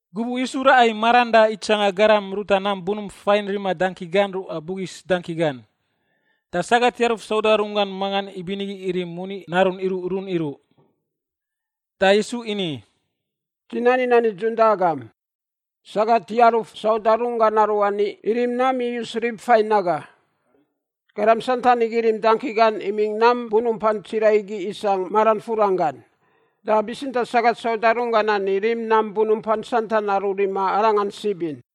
Gubuꞌ Yisu raꞌa i maran da itsanga garam ruta nam bunump fain rima dangki gan ruꞌa bugis dangki gan. Da sagat yaruf sauda runggan mangan ibinigi irim moni narun iruꞌrun iruꞌ. Da Yisu ini, “Dzi nani nan nidzun da agam, sagat yaruf sauda runggan aruani irim nam iyus rib fain aga. Garam santan igi irim dangki gan imingꞌ nam bunumpan tsiraꞌ igi isangꞌ maran furan gan. Da bitsintaꞌ sagat sauda runggan ani rim nam bunumpan santan aru rima arangan sib in.”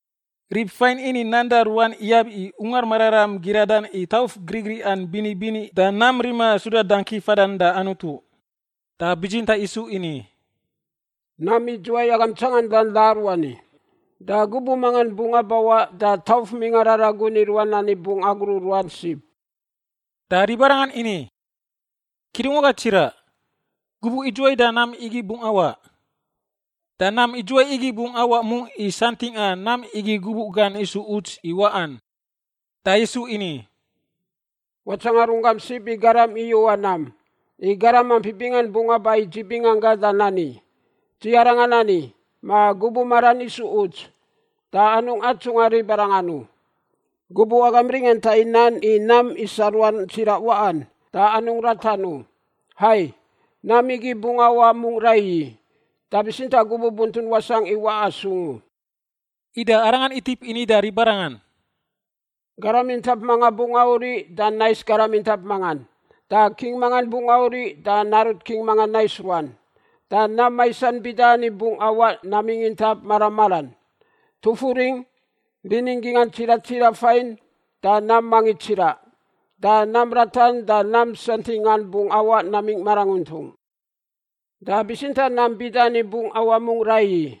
Rib fain ini nan da ruan iyab i Ungar Mararam giradan i tauf grigriꞌan bini bini da nam rima suda dangki fadan da Anutu. Da bitsintaꞌ Yisu ini, “Nam idzuwai agam tsangandan da aruani, da gubuꞌ mangan bungꞌ abawaꞌ da tauf mingꞌa raragun i ruan ani bungꞌ agruꞌ ruan sib.” Da ribarangan ini, “Kidungwaga tsiraꞌ, gubuꞌ idzuwai da nam igi bungꞌ awaꞌ? Da nam idzuwai igi bungꞌ awaꞌ mungꞌ i santingꞌa nam igi gubuꞌ gan isu uts i waꞌan?” Da Yisu ini, “Watsanga runggam sib i garam iyuꞌa nam. I garam ampi bingan bungꞌ aba i dzi binganggangꞌ da nani, ‘Dzi Arangan ani,’ ma ‘Gubuꞌ maran isu uts.’ Da anungꞌ atsungꞌa ribarangan u. Gubuꞌ agam ringanta i nan i nam isa ruan tsiraꞌ waꞌan, da anungꞌ ratan u. Hai, nam igi bungꞌ awaꞌ mungꞌ raiyi, da bitsintaꞌ gubuꞌ buntun wasangꞌ i waꞌa sung u.” Ida Arangan itip ini da ribarangan, “Garam intap manga bungꞌ auriꞌ da nais garam intap mangan, da king mangan bungꞌ auriꞌ da narut king mangan nais ruan. Da nam maisan bida ani bungꞌ awaꞌ namingꞌ intap mara maran: tufuringꞌ, rinin gingꞌan tsiraꞌ tsiraꞌ fain da nam mangits tsiraꞌ, da nam ratan da nam santingꞌan bungꞌ awaꞌ namingꞌ maranguntung. “Da bitsintaꞌ nam bida ani bungꞌ awaꞌ mungꞌ raiyi: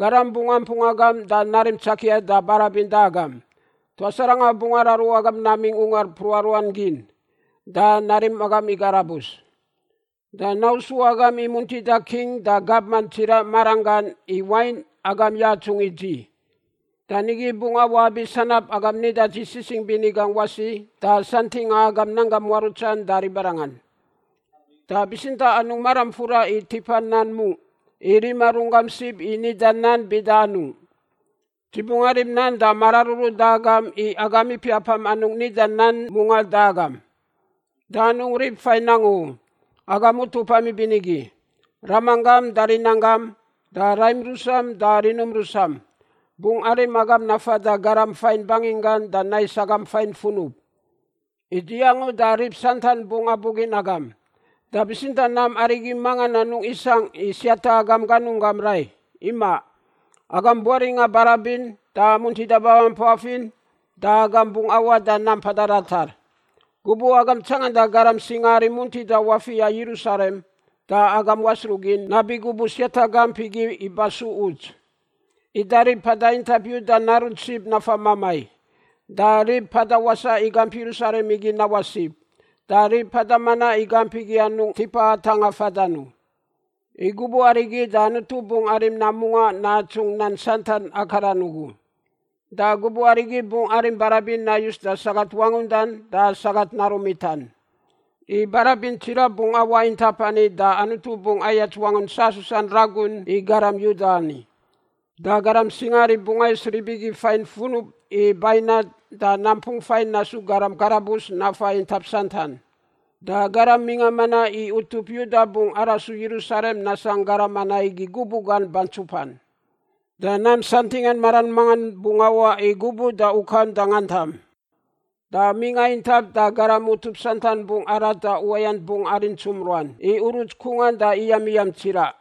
garam bungꞌ ampung agam da narim tsakia da barabin da agam. Tuas arangan bungꞌ araru agam namingꞌ ungar mpruꞌa ruan gin da narim agam i karabus. Da nausu agam i muntida king da gabman tsiraꞌ maranggan i wain, agam yatsungꞌ i dzi. Da nigi bungꞌ awaꞌ abi sanab agam nida dzi sisingꞌ bini gangꞌ wasi da santingꞌa agam nanggam muarutsan da ribarangan. Da bitsintaꞌ anungꞌ maram fura i tipa nan mungꞌ i rima runggam sib i nida nan bida anungꞌ. Dzi bungꞌ arim nan da mararuru da agam i agam ipiapam anungꞌ nida nan mungaꞌ da agam. Da anungꞌ rib fain angu u, agam utupam ibinigi — ramanggam da rinanggam da raim rusam da rinum rusam — bungꞌ arim agam nafan da garam fain banginggan da nais agam fain funub. I dzi angu da rib santan bungꞌ abugin agam. Da bitsintaꞌ nam arigi mangan anungꞌ isangꞌ siata agam ganunggam rai, imaꞌ. Agam buaringꞌa barabin da muntida babampaf in da agam bungꞌ awaꞌ da nam mpada ratar. “Gubuꞌ agam tsanganda garam singaari muntida wafiꞌa Yerusalem da agam wasruꞌ gin nabi gubuꞌ siata gamp igi iba su uts. Ida rib mpada intap Yuda narunt sib nafa mamai, da rib mpada wasaꞌ i gamp Yerusalem igi nawaꞌ sib, da rib mpada manaꞌ i gamp igi anungꞌ tipa atangꞌa fadan u. I gubuꞌ arigi da Anutu bungꞌ arim nam mungaꞌ natsungꞌ nan santan akaran ugu. Da gubuꞌ arigi bungꞌ arim barabin nayus da sagat wangundan da sagat narun mitan. I barabin tsiraꞌ bungꞌ awaꞌ intap ani da Anutu bungꞌ ayats wangun sasusan ragun i garam Yuda ani. Da garam singaari bungꞌ ais rib igi fain funub i bainat da nampung fain nasu garam karabus nafa intap santan. Da garam mingꞌa manaꞌ i utup Yuda bungꞌ arasu Yerusalem nasangꞌ garam manaꞌ igi gubuꞌ gan bantsupan. “Da nam santingꞌan maran mangan bungꞌ awaꞌ i gubuꞌ da ukam da ngantam. Da mingꞌa intap da garam utup santan bungꞌ arat da uwayant bungꞌ arintsum ruan i uruts kungan da iyamiyam tsiraꞌ.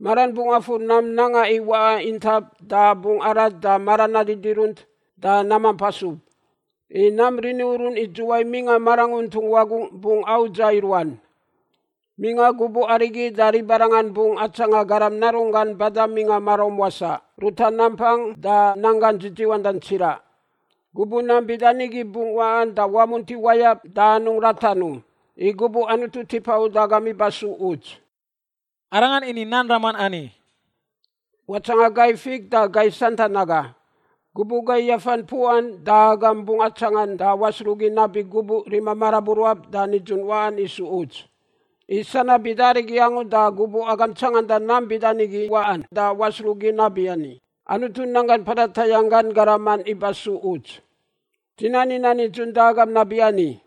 Maran bungꞌ afur nam nanga i waꞌa intap da bungꞌ arat da maran nadidirunt da namamp asub, i nam rini urun idzuwai mingꞌa maranguntung wagungꞌ bungꞌ audza i ruan. Mingꞌa gubuꞌ arigi da ribarangan bungꞌ atsanga Garam Narunggan bada mingꞌa maraum wasaꞌ ruta nampang da nanggan dzidziwandan tsiraꞌ. Gubuꞌ nam bida nigi bungꞌ waꞌan da wamunti wayab da anungꞌ ratan u, i gubuꞌ Anutu tipa uda agam iba su uts.” Arangan ini nan raman ani, “Watsanga gai fik da gai santan aga. Gubuꞌ gai yafan puꞌan da agam bungꞌ atsangan da wasruꞌgin nabi gubuꞌ rima maraburuab da nidzun waꞌan isu uts. I sanab bida arigi angu da gubuꞌ agam tsanganda nam bida nigi waꞌan da wasruꞌgin nabiani, Anutu nanggan mpada tayangꞌ gan garaman iba su uts. Dzi nani nan nidzun da agam nabiani,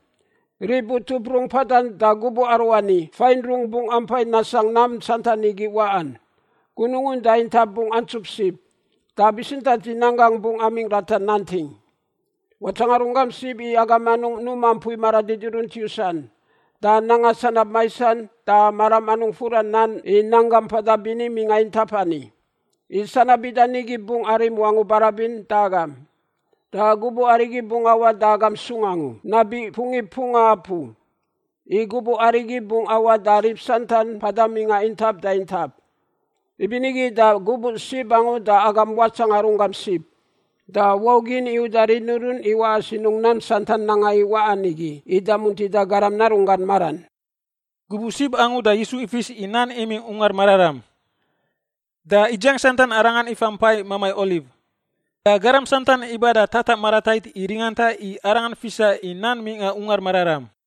rib utup rungꞌ mpadan da gubuꞌ aruani fain rungꞌ bungꞌ ampai nasangꞌ nam santan igi waꞌan. Gunungun da intap bungꞌ antsup sib, da bitsintaꞌ dzi nan gangꞌ bungꞌ amingꞌ ratar nanting. “Watsanga runggam sib i agam anungꞌ numa mpui maradidirunt yusan da nanga sanab maisan da maram anungꞌ furan nan i nanggam mpada bini mingꞌa intap ani. I sanab bida nigi bungꞌ arim wangu barabin da agam, da gubuꞌ arigi bungꞌ awaꞌ da agam sung angu nabi pungip mpunga apu. I gubuꞌ arigi bungꞌ awaꞌ da rib santan mpada mingꞌa intap da intap. Ibinigi da gubuꞌ sib angu da agam watsanga runggam sib, da waugin i uda rini urun i waꞌa sinungꞌ nam santan nanga i waꞌan igi ida muntida Garam Narunggan maran.” Gubuꞌ sib angu da Yisu ifis i nan imingꞌ Ungar Mararam, da idziang santan Arangan ifa mpai Mamai Oliv. Da garam santan iba da tataꞌ maratait i ringanta i Arangan fisa i nan mingꞌa Ungar Mararam.